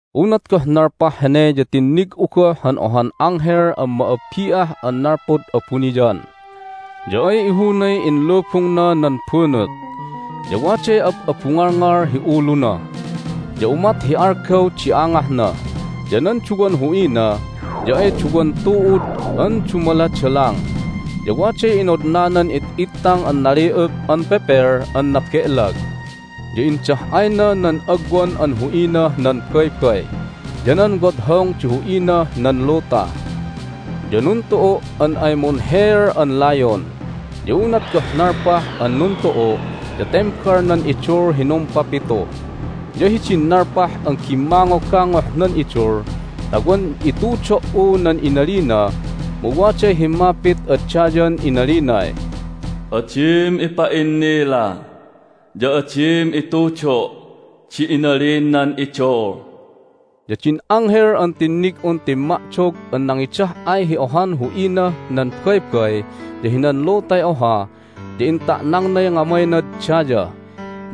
Unat goh nalpah hene ya tinnig'u goh han ohan anghel an ma'abbi'ah an nalpud abuniyan. Ya ay ihunay inlubungna nan bunut, ya waday ab'abungalngal hi uluna. Ya umat hi algaw di angahna, ya nan duwan hu'ina ya ay duwan tu'ud an dumaladalang. Ya waday inodnanan it'ittang an nali'up an pepel an nabe'lag. Ya indah'ayna nan agwan an hu'inah nan baybay, ya nan wodhong di hu'inah nan luta. Ya nuntu'u' an ay munheel an layon. Ya unat goh nalpah an nuntu'u' ya tembal nan idul hi numpapitu. Ya hidin nalpah an gimmangogangoh nan idul ta wan itudo"u nan inalina mu waday himmapit ad dayan inalinay, "Adim ipa'innila, ya adim itudo' di inalin nan idul!" Ya din anghel an tinnig'un timma'dog an nangidah'ay hi ohan hu'inah nan baybay ya hinan lutay oha ya inta'nangnay ngamaynad daya,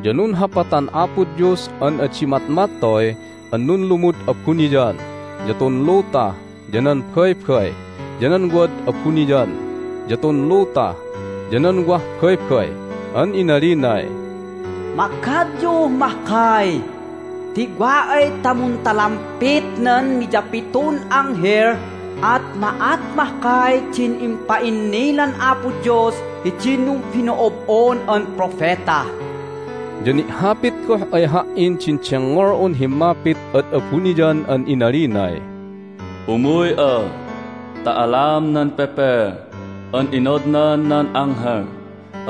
ya nunhapatan Apo Dios an adi matmattoy an nunlumud abuniyan, ya tun luta, ya nan baybay, ya nan wad abuniyan, ya tun luta, ya nan wah baybay. An inalinay, "Magadyuh mahkay! Ti wa ay ta muntalampet nan miyapitun anghel at ma'at mahkay din impa'innilan Apo Dios hidin numbino'ob'on an propeta." Ya ni'hapit goh ay ha"in din dengngol'un himmapit ad abuniyan an inalinay, "Umuy'a ta alam nan pepel an inodnan nan anghel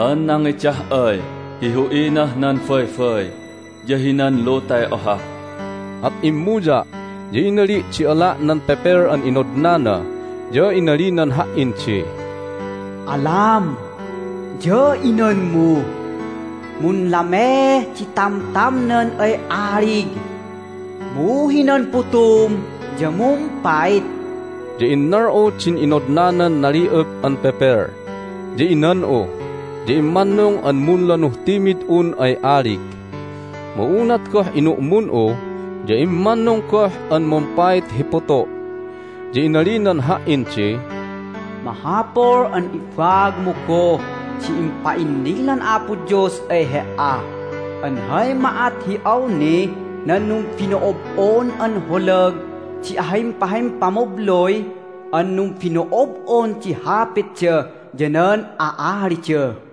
an nangidah'ay hi hu'inah nan baybay ya hinan lutay oha." At immuya', ya inali' di ala' nan pepel an inodnana, ya inalinan ha"in di, "Alam, ya inanmu. Munlameeh di tamtamnan ay alig, mu hinan putum ya mumpait." Ya innal'u din inodnanan nali'up an pepel, ya inan'u, ya immannung an munlanuh timid'un ay alig. Mu unat goh inu'mun'u ya immannung goh an mumpait hi putu'. Ya inalinan ha"in di, "Mahapul an ibaagmu goh di impa'innilan Apo Dios ay he"a an hay ma'at hi awnih nan numbino'ob'on an holag di ahimpahimpamabluy an numbino'ob'on di hapitda ya nan a'alida."